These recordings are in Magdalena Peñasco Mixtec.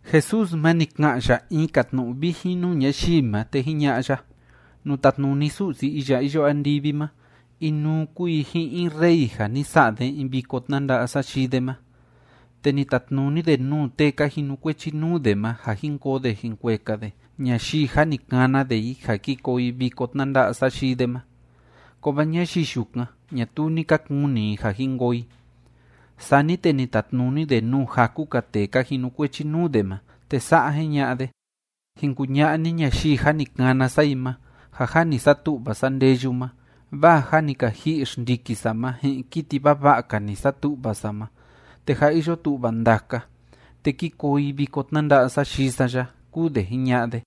Jesús ma, ni ka'an ya in‑ka tnu'u vijin nuu ñayii ma, te jiña'a ya: ―Nuu tatnuni Su'si iya iyo andivi ma, inuu kúu i ji'in in rey ja ni sa'a de in viko tnanda'a sayii de ma. Te ni tatnuni de nuu tee ka jinukuechi nuu de ma ja jín koo de jín kueka de ñayii jâ ni kana de i ja ki koo i viko tnanda'a sayii de ma, kovaa ñayii yukan, ñatuu ni ka kuni i ja jin koo i. Sani te ni tatnuni de nuu jaku‑ka tee ka jinukuechi nuu de ma, te sa'a jiña'a de: “Jin kuña'a ni ñayii jâ ni kana sa i ma ja jâ ni satu'va sa ndeyu ma, vaa jâ ni ka ji'i xndiki sa ma ji'in kiti vava'a‑ka ni satu'va sa ma, te jâ iyo tu'va ndaka, te kí koo i viko tnanda'a sayii sa ya”, kúu de jiña'a de.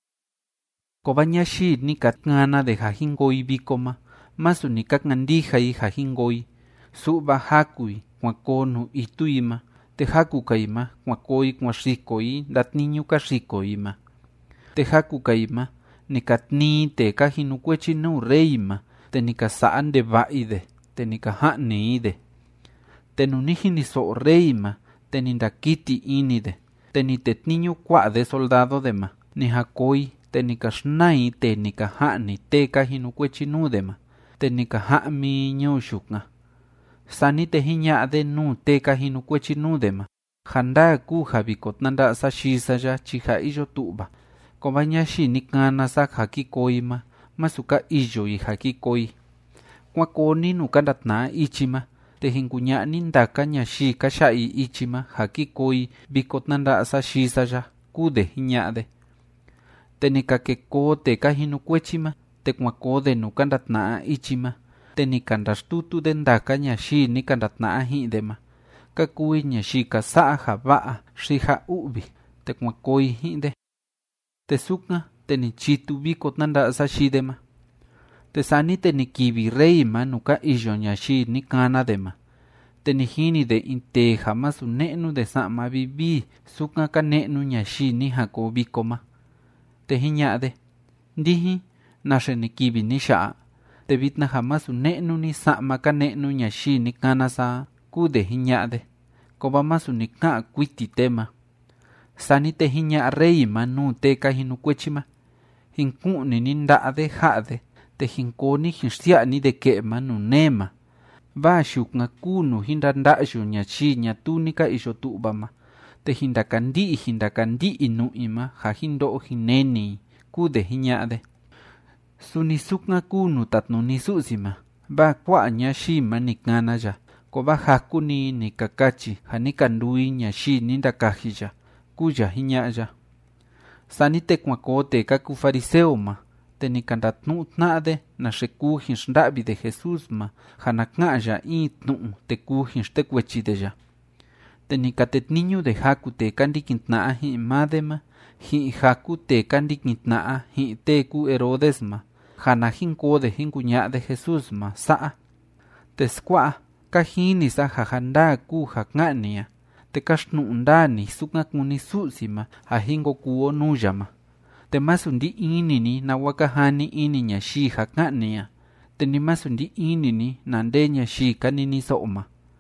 Kovaa ñayii ni ka kana de ja jin koo i viko ma, masu ni ka kandija i ja jin koo i, su'va jaku i kuan koo nuu itu i ma, te jaku‑ka i ma kuan koo i kuan xiko i ndatniñu ka xiko i ma, te jaku‑ka i ma, ni ka tnii i tee ka jinukuechi nuu rey ma, te ni ka sa'a ndeva'a i de, te ni ka ja'ni i de. Te nuu ni jiniso'o rey ma, te ni ndakiti ini de, te ni tetniñu kua'a de soldado de ma. Ni jan koo i, te ni ka xnaa i tee ni ka ja'ni tee ka jinukuechi nuu de ma, te ni ka ja'mi i ñuu yukan. Sani te jiña'a de nuu tee ka jinukuechi nuu de ma: “Ja ndaa kúu ja viko tnanda'a sayii sa ya chi jâ iyo tu'va, kovaa ñayii ni kana sa ja ki koo i ma, masu ka iyo i ja ki koo i. Kuán koo ni nuu ka ndatna'a ichi ma, te jin kuña'a ni ndaka ñayii ka ya'a i ichi ma ja kí koo i viko tnanda'a sayii sa ya”, kúu de jiña'a de. Te ni ka ke koo tee ka jinukuechi ma, te kuan koo de nuu ka ndatna'a ichi ma, te ni ka ndaxtutu de ndaka ñayii ni ka ndatna'a ji'in de ma, ka kuu i ñayii ka sa'a ja va'a xi ja u'vi, te kuan koo i ji'in de. Te sukan, te ni chitu viko tnanda'a sayii de ma. ’Te sani te ni kivi rey ma nuu ka iyo ñayii ni kana de ma, te ni jini de in tee ja masu ne'nu de sa'ma vivii sukan ka ne'nu ñayii ni jan koo viko ma. Te jiña'a de: “¿Ndijin, naxe ni kivi ni ya'a? Te vitna ja masu ne'nu ni sa'ma ka ne'nu ñayii ni kana sa a”, kúu de jiña'a de. Kovaa masu ni ka'an kuiti tee ma. Sani te jiña'a rey ma nuu tee ka jinukuechi ma: “Jin ku'ni ni nda'a de ja'a de, te jin koo ni jin xsia'a ni de ke'e ma nuu nee ma, vaa yukan kúu nuu jin ndanda'yu ñayii ñatuu ni ka iyo tu'va ma, te jin ndakandi'i jin ndakandi'i i nu'u i ma ja jin ndo'o jin neni i”, kúu de jiña'a de. Suni sukan kúu nuu tatnuni Su'si ma, vaa kua'a ñayii ma ni kana ya, kovaa jaku‑ni i ni ka kachi ja ni ka nduu i ñayii ni ndakaji ya ―kúu ya jiña'a ya. Sani te kuan koo tee ka kuu fariseo ma, te ni ka ndatnu'u tna'a de naxe kuu jin xnda'vi de Jesús ma, ja na ka'an ya in tnu'u, te kuu jin xtekuechi de ya. Te ni ka tetniñu de jaku tee ka ndikin tna'a ji'in maa de ma, ji'in jaku tee ka ndikin tna'a ji'in tee kúu Herodes ma, ja na jin koo de jin kuña'a de Jesús ma sa'a: ―Teskua'a, ka jini sa ja ja ndaa kúu ja ká'an ni a, te káxtnu'u ndaa ni sukan kúni Su'si ma ja jin ko kuu o nuu ya ma. Te masu ndí ini ni nawa ka jani ini ñayii ja ká'an ni a. Te ni masu ndí ini ni na nde ñayii ka niniso'o ma.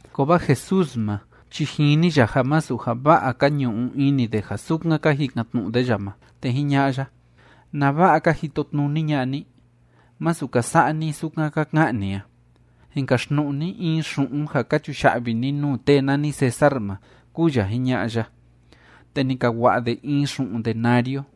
Kovaa Jesús ma chi jini ya ja masu ja va'a ka ñu'u ini de ja sukan ka jikan‑tnu'u de ya ma, te jiña'a ya: ―¿Nava'a ka jitotnuni ña'a ni? ¡Masu ka sa'a ni sukan ka ka'an ni a! Jin kaxtnu'u ni in xu'un ja ka chuya'vi ni nuu tee nani César ma ―kúu ya jiña'a ya. Te ni ka wa'a de in xu'un denario,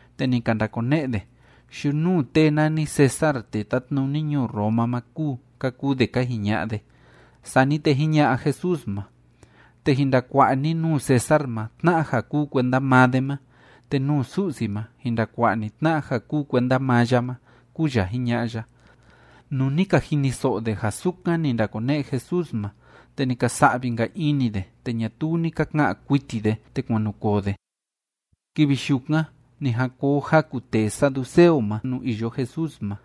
Te ni ka ndakone'e de: ―Yunuu tee nani César tee tátnuni ñuu Roma ma kúu ―ka kuu de ka jiña'a de. Sani te jiña'a Jesús ma: ―Te jin ndakua'a ni nuu César ma tna'a ja kúu kuenda maa de ma, te nuu Su'si ma jin ndakua'a ni tna'a ja kúu kuenda maa ya ma ―kúu ya jiña'a ya. Nuu ni ka jiniso'o de ja sukan ni ndakone'e Jesús ma, te ni ka sa'vi‑nka ini de, te ñatuu ni ka ka'an kuiti de, te kuan nu koo de. Kivi yukan ni jan koo jaku tee saduceo ma nuu iyo Jesús ma.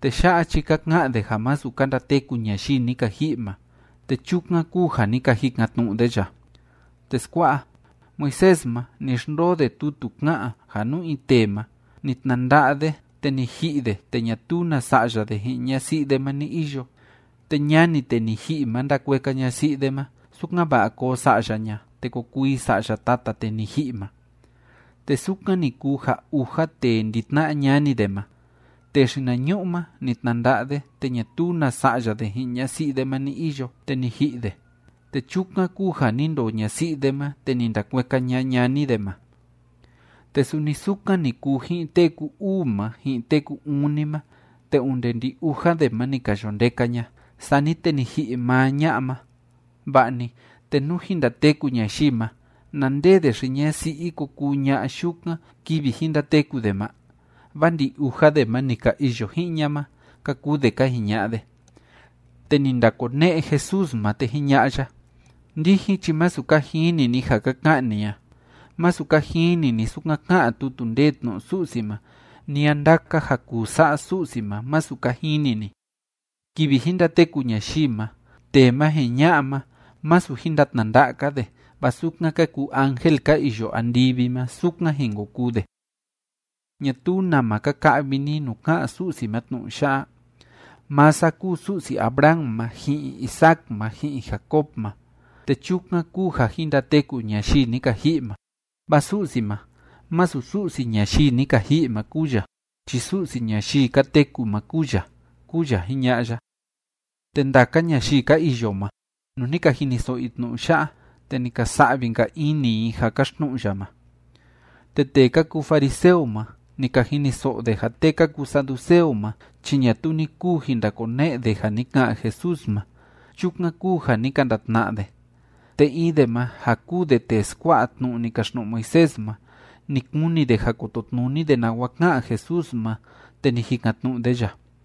Tee ya'a chi ka ka'an de ja masu ka ndateku ñayii ni ka ji'i ma. Te chukan kúu ja ni ka jikan‑tnu'u de ya: ―Teskua'a, Moisés ma, ni xndoo de tutu ká'an ja nú in tee ma, ni tnanda'a de te ni ji'i de te ñatuu na sa'ya de ji'in ñasi'i de ma ni iyo, te ñani tee ni ji'i ma ndakueka ñasi'i de ma, sukan‑va'a koo sa'ya ña, te ko kuu i sa'ya tata tee ni ji'i ma. Te sukan ni kuu ja uja tee ndi‑tna'a ñani de ma. Tee xinañu'u ma, ni tnanda'a de, te ñatuu na sa'ya de ji'in ñasi'i de ma ni iyo, te ni ji'i de, te chukan kúu ja ni ndoo ñasi'i de ma, te ni ndakueka ña ñani de ma. Te suni sukan ni kuu ji'in tee ku‑uu ma, ji'in tee ku‑uni ma, te onde ndi‑uja de ma ni ka yo ndeka ña. Sani te ni ji'i maa ña'a ma. Va'a‑ni, te nú jin ndateku ñayii ma, ¿na nde de xi‑ñasi'i ko kuu ña'a yukan kivi jin ndateku de ma? Vaa ndi‑uja de ma ni ka iyo ji'in ña ma ―ka kuu de ka jiña'a de. Te ni ndakone'e Jesús ma, te jiña'a ya: ―Ndijin chi masu ka jini ni ja ka ka'an ni a. Masu ka jini ni sukan ká'an tutu ndee tnu'u Su'si ma, ni a ndaka ja kuu sa'a Su'si ma masu ka jini ni. Kivi jin ndateku ñayii ma, tee ma ji'in ña'a ma, masu jin ndatnanda'a‑ka de, vaa sukan ka kuu ángel ka iyo andivi ma, sukan jin ko kuu de. ¿Ñatuu nama ka ka'vi ni nuu ká'an Su'si ma tnu'u ya'a?: “Maa sa kúu Su'si Abraham ma ji'in Isaac ma ji'in Jacob ma.” Te chukan kúu ja jin ndateku ñayii ni ka ji'i ma, vaa Su'si ma, masu Su'si ñayii ni ka ji'i ma kúu ya chi Su'si ñayii ka teku ma kúu ya ―kúu ya jiña'a ya. Te ndaka ñayii ka iyo ma, nuu ni ka jiniso'o i tnu'u ya'a, te ni ka sa'vi‑nka ini i ja káxtnu'u ya ma. Te tee ka kuu fariseo ma, ni ka jiniso'o de ja tee ka kuu saduceo ma chi ñatuu ni kuu jin ndakone'e de ja ni ka'an Jesús ma. Chukan kúu ja ni ka ndatna'a de. Te in de ma, ja kúu de tee skua'a tnu'u ni kaxtnu'u Moisés ma, ni kuni de ja kototnuni de nawa ka'an Jesús ma, te ni jikan‑tnu'u de ya: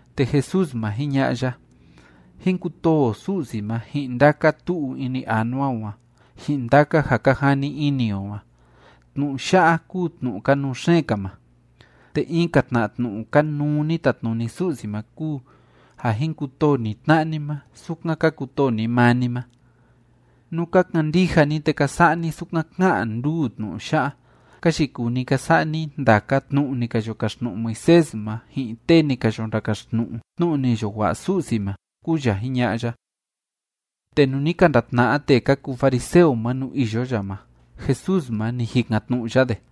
Te Jesús ma, jiña'a ya: ―“Jín kutoo o Su'si o ma ji'in ndaka tu'u ini anua o a, ji'in ndaka ja ka jani ini o a.” Tnu'u ya'a kúu tnu'u kanuu xeen‑ka ma. Te in‑ka tna tnu'u kanuu ni tatnuni Su'si ma kúu ja: “Jin kutoo ni tna'a ni ma, sukan ka kutoo ni maa ni ma.” Nú ka kandija ni te ka sa'a ni sukan ká'an nduu tnu'u ya'a, ka yikuu ni ka sa'a ni ndaka tnu'u ni ka yo kaxtnu'u Moisés ma, ji'in tee ni ka yo ndakaxtnu'u tnu'u ni yo wa'a Su'si ma ―kúu ya jiña'a ya. Te nuu ni ka ndatna'a tee ka kuu fariseo ma nuu iyo ya ma, Jesús ma, ni jikan‑tnu'u ya de: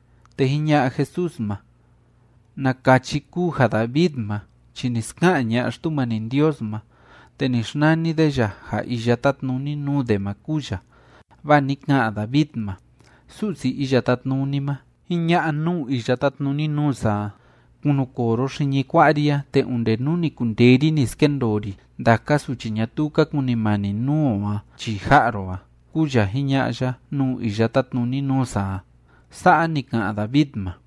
Te jiña'a Jesús ma: ―¿Na kachi kúu ja David ma chi ni ska'an ña'a Xtumani Ndios ma, te ni xnani de ya ja iya tátnuni nuu de ma kúu ya? Vaa ni ka'an David ma: Su'si Iya Tátnuni ma jiña'a nuu iya tátnuni nuu sa a: “Kunukoo ro xiñi kua'a ri a, te onde nú ni kundee ri ni skendoo ri ndaka suchi ñatuu ka kunimani nuu o a chii ja'a ro a”, kúu ya jiña'a ya nuu iya tátnuni nuu sa a. Sa'a ni ka'an David ma.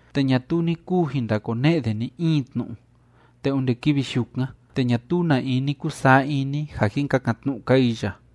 Te ñatuu ni kuu jin ndakone'e de ni‑in tnu'u. Te onde kivi yukan, te ñatuu na in ni kusaa ini ja jin kakan‑tnu'u‑ka i ya.